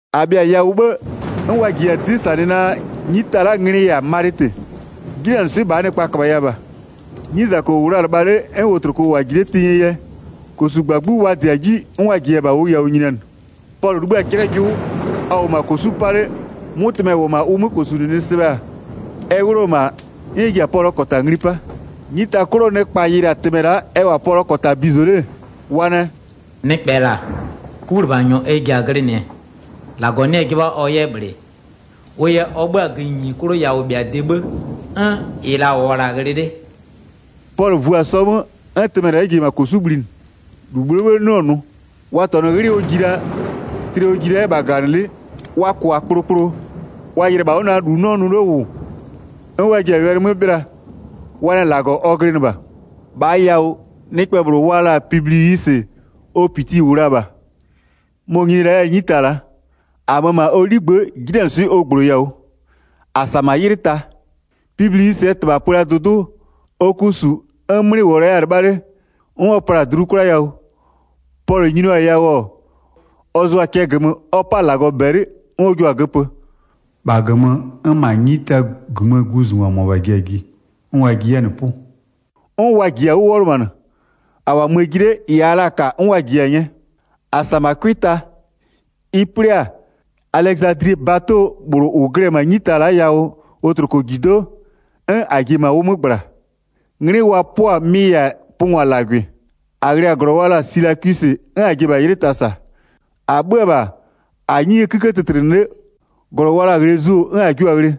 1-A bhɩa-a yawʋ 'bhë 'n wa jiya-a 'dɩ -sanɩ naa, 'nyita la'aa nglɩ-ɩ -yɛ-a Malɩtɩ. 'Jinanɩswɩ'ɩ -bhaa nɩkpa -köbhaya -bha. 'Nyizako -wʋ la-a lɩbha 'le 'n wotloko -wʋ-a ji 'le tenyie yɛ, -kosugbagbu wa -dɩ-a 'ji 'n wa -jiya-a -bha ʋ yawʋ nyinianɩ. Pɔlʋ 'libhï-a 'clɛjʋ, ɔ -wʋʋ -ma -kosu'u 'pa 'le, 'mʋtɩmɛ -wʋ-ɔ -ma ʋ 'mö -kosunɩnɩ sɩbhɛ-a, ɛ 'wlʋ-ɔ -ma 'n ɛ ji-a Pɔlʋɔ -kɔta ngli 'pa. 'Nyita 'klʋɔ nɩkpa yɩlɩ-a tɩmɛ la'a ɛ -wʋ-a Pɔlʋɔ -kɔta bizo 'le-e, wa nɛ: “Nɩkpɛ -la, 'kulɩbhanyɔ ɛ ji-a glɩnɩɛ. -Lagɔ 'nɩ-ɛ 'jɩbha ɔ 'yɛ -bhlɩ, wʋ yɛ ɔ 'bhö-a gïnyi 'klʋ yawʋbhɩade 'bhë, 'n -ɩ -la -wʋɔ-ɔ -la ghlɩ 'le.” Pɔlʋ vu-a sɔ 'mö, 'n tɩmɛ ji-e -ma -kosu'u bhlinɩ, -lu -bhlʋɔ 'bhë 'nɩɔ-ɔ nʋ. Wa -tɔnʋ 'ghlɩɛ ɔ ji la, tlɩɛ ɔ ji la 'yɛ -bha -gaganɩlɩ'ɩ. Wa -kʋ-a kplokplo, wa yɩlɩ-ɛ -bha 'wʋ naa -lu 'nɩɔ nʋ 'le -wʋ 'n wa ji-a wɛlɩ 'mö 'bhɩla, wa nɛ -lagɔ ɔ glɩnɩ -bha. 7-Bhaa yawʋ, nɩkpɛ -bhlʋ wa la-a Pibliwisɩ, ɔ -piti -wʋ la-a -bha. Mɔ-ɔ nyini la 'yɛ-a 'nyita la'a. -A mö-ö -ma ɔ 'ligbë'ë, 'jinanɩswɩ'ɩ ɔ -gbloya-a 'wʋ. -A -sa -ma 'ylɩ ta. Pibliwisɩɛ -tɩbha pö la dʋdʋ'ʋ, ɔ ku -su 'n 'mlɩ -wʋ-ɔ la 'yɛ-a 'lɩbha 'le, 'n ɔ pla-a dlu 'kwla yawʋ, Pɔlʋ nyinio-a yawʋ, ɔ zʋɔ-a cɛ -gömö ɔ 'pa-a -Lagɔ -bɛlɩ 'n ɔ jio-a göpö. 9-Bha -gömö, 'n -ma 'nyita -gömöö guzungwa -mʋabha ji-a ji, 'n wa ji 'yɛ-a -nɩ 'pʋ. 'N wa -jiya-a 'wʋ 'wɔlʋmanɩ. -A -wʋ-a möö ji 'le, -ɩ -aa la-a -ka 'n wa -jiya-a 'nyɛ. Pɔlʋ yɛ -ma Ghlɔmö nyini 11-A -sa-a -ma 'cʋɩ ta. Ɩ 'plɩ-a, Alɛzadlie bato -bhlʋ -ʋ glɩ-ɛ -ma 'nyita la'a yawʋ wotlokojido'o, 'n -a ji-e -ma ʋ 'mö -gbla. 'Nglɩ wa 'pʋ-a mɩ -yɛ-a Pʋngwalagʋɩ. 12-A ghlɩ-a -glɔ wa la-a Silakwisɩ, 'n -a ji-e -bha 'ylɩ ta -sa. 13-A 'bhö-ö -bha, -a-a 'nyie 'kïkë tɩtlɩnɩ 'le, -glɔ wa la-a Ghlezio 'n -a jiʋ-a ghlɩ.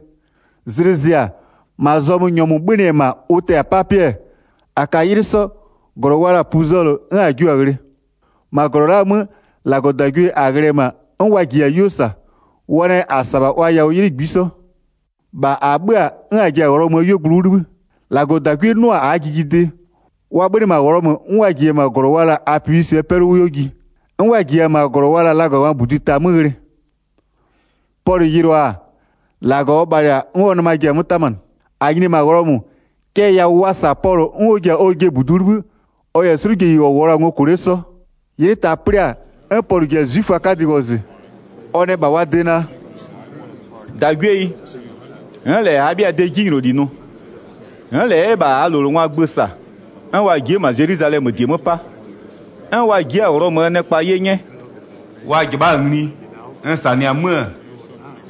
Zlɩ zɩ-a, -ma zɔmö nyɔmʋ 'bhönɩ-ɛ -ma ʋ tɛ-a 'papɩɛ, -a ka 'ylɩ 'sɔ, -glɔ wa la-a Puzolɩ, 'n -a jiʋ-a ghlɩ. 14-Ma -glɔ la'aa 'mö, -Lagɔdagwie -a ghlɩ-ɛ -ma 'n wa -jiya-a 'yuo -sa, wa nɛ -a -sa -bha wa yawʋ 'ylɩ -ngbisɔ. -Bha -a 'bhö-a, 'n -a ji-a Ghlɔmöö 'yuogblʋ 'wʋ 'libhï. 15-Lagɔdagwie 'nʋ-a -aa jijidɩ, wa 'bhönɩ -ma Ghlɔmö 'n wa -jiya-a -ma -glɔ wa la-a Apiwisɩɛ 'pɛlʋ 'wʋ 'yuo ji. 'N wa -jiya-a -ma -glɔ wa la-a Lagangwaa -Budi Ta 'mö ghlɩ. Pɔlʋ yɩlʋa-a, -Lagɔ ɔ bhalɩ-a 'n ɔ nɩma ji-a 'mö 'tamanɩ. 16-A nyini-e -ma Ghlɔmö-ö, cɛ yawʋ wa -sa-a Pɔlʋ 'n ɔ ji-a ɔjɩɛ -budu 'wʋ 'libhï, ɔ -yɛ 'slʋjeyi -ɔ -wʋɔ la-a ngo -kʋ 'le 'sɔ. Pɔlʋ yɛ -ma Ghlɔmö -Lagɔwɛlɩ gbanɩ 17'Ylɩ ta 'plɩ-a, 'n Pɔlʋ ji-a 'zwiföaa 'kadɩ wɔzɩ. Wa ji-a, ɔ nɛ -bha wa de naa: “-Dagwieyi, n'n -lɛ -abhɩaa de 'jinyloli nʋ, n'n -lɛ 'yɛ -bha -aa -lowlengwaa gbö -sa, 'n wa ji'i-e -ma Zelwizalɛmö -die 'mö 'pa, 'n wa ji'i-a Ghlɔmöö nɩkpa 'ye 'nyɛ. 18Wa -jɩbha'a-a ngli, n -sanɩ-a 'mö-ö,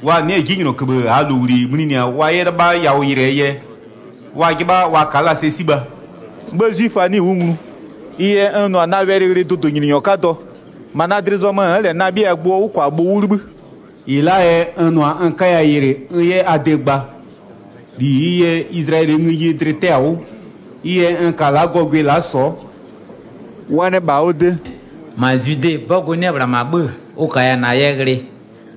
wa nɩ'ɩ-ɛ 'jinylɔköbhë -aa -lowli mlinɩ-a wa 'yɛ 'lɩbha yawʋ yɩlɩɛ yɛ, wa 'jɩbha wa ka'a la sɛ 'sibha. 19'Bhë 'zwiföa 'nɩɩ-ɩ 'wʋ nglu, ɩ yɛ n nʋ-a na wɛlɩ ghlɩ dʋdʋnyininyɔ 'kadɔ. -Ma na dlɩ zɔmö n'n -lɛ na 'bhɩa gbʋɔ 'wʋkwabhʋ 'wʋ 'libhï. 20-Ɩ la'aa yɛ n nʋ-a n 'kaya yɩlɩ n 'yɛ a de gba. -Li -ɩɩ yɛ Izlayɛlɩɛ ngëyie dlɩ 'tɛ-a 'wʋ, ɩ yɛ n ka-a la'a gɔgwɩ la'a sɔ'ɔ.” 21Wa nɛ -bha ɔ de: “-Ma Zwide 'bɔgʋ 'nɩ-ɛ -ma 'bhö-ö ʋ -kaya -na yɛ ghlɩ.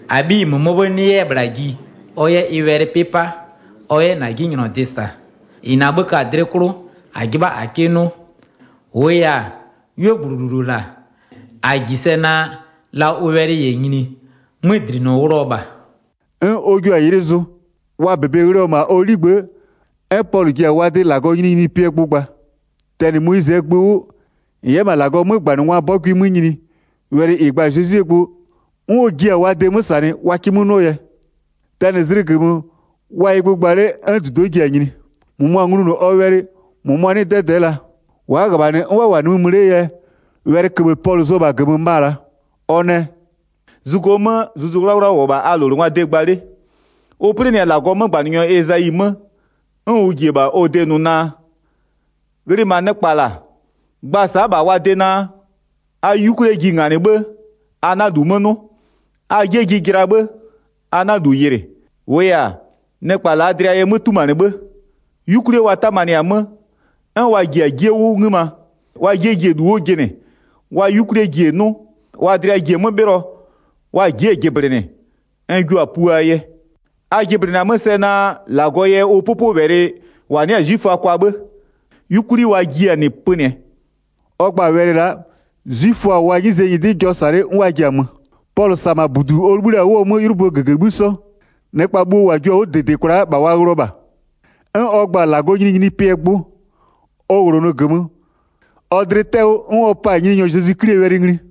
-Abhiyi -mʋmɔɔ 'bhë 'nɩ-ɛ 'yɛ -bhla ji ɔ 'yɛ wɛlɩ 'pɩ 'pa, ɔ 'yɛ -na 'jinylɔdɩ -sa. 22-Ɩ -na 'bhë ka-a dlɩ 'klʋ -a 'jɩbha -a 'kɩ 'nʋ. -Wʋʋ yɛ-a, 'yuogblʋ -lulu -la, -a -ji sɛ naa, la ʋ wɛlɩ -yɛ nyini, 'mödlinɔ wlʋ-ɔ -bha.” 23'N wa jio-a 'ylɩ zʋ. Wa -bebe ghlɩɔ-ɔ -ma ɔ 'ligbë'ë, 'n Pɔlʋ ji-a wa de -Lagɔɔ nyininyinipɩɛ gbʋ gba. Tɛnɩ Moyizɩɛ gbö 'wʋ, -n 'yɛ -ma -Lagɔɔ 'mögbanɩngwaa 'bɔgʋɩ 'mö nyini, wɛlɩ -ɩ gba-a Zezwie gbʋ, 'n ɔ jiɩ-a wa de 'mö -sanɩ wa 'kɩ 'mö 'nʋɔ yɛ. Tɛnɩ zlɩgömö, wa-a ɩ gbʋ gba 'le 'n -dudo'o ji-a nyini. 24-Mʋmʋa nglunʋ ɔ wɛlɩ, -mʋmʋa 'nɩɩ-ɩ 'dɛdɛ'ɛ la. 25Wa'a -ghöbhanɩ 'n wa -wʋ-a nimï mö 'lee yɛ, wɛlɩköbhë Pɔlʋ zʋ-ɔ -bha -gömö ma-a la'a. Ɔ nɛ: “Zugo 'mö Zuzu 'Wlawla -wʋ-ɔ -bha a -lowlengwaa de gba 'le, ʋ 'plɩnɩ-a -Lagɔɔ 'mögbanɩnyɔ Ezayi 'mö, 'n ʋ ji-e -bha ɔ de nʋ naa: 26Ghlɩ -ma nɩkpa -la, gba sa'a -bha wa de naa: A 'yukwlie ji nganɩ 'bhë, a 'na -lu 'mö 'nʋ. A 'jie ji jɩla 'bhë, a 'na -lu yɩlɩ. 27-Wʋʋ yɛ-a, nɩkpa -laa dlɩa yɛ 'mö 'tumanɩ 'bhë, 'yukwlie wa 'tamanɩ-a 'mö, 'n wa ji-a 'jie 'wʋ 'ngïma wa 'jie ji-e -lu 'wʋ jɩnɩ, wa 'yukwlie ji-e 'nʋ, wa dlɩa ji-e 'mö 'bhɩlɔ, wa ji'i-e jɩblɩnɩ, n jua-a puaa yɛ. 28A jɩblɩnɩ-a 'mö sɛ naa -Lagɔ yɛ ʋ 'pʋpʋwɛlɩ -wa 'nɩ-a 'zwiföa kwa 'bhë, 'yukwli wa jiɩ-a -nɩ pönɩɛ.” 29Ɔ gba-a wɛlɩ la'a, 'zwiföa-a wa 'nyize nyɩdɩ jɔ -sa 'le 'n wa ji-a mö. 30Pɔlʋ -sa-a -ma -budu ɔ 'libhï la-a 'wʋɔ 'mö 'ylʋböö -gëgëbhï 'sɔ. Nɩkpa bhuo -wa jio-a 'wʋ -dɩdɩ kwla'a -bha wa ghlɩɔ -bha. 31'N ɔ gba-a -Lagɔɔ nyininyinipɩɛ gbʋ. Ɔ -wlonʋ -gömö, ɔ dlɩ 'tɛ-ɛ 'wʋ 'n ɔ pa-a Nyininyɔ Zezwi 'Klie wɛlɩ ngli.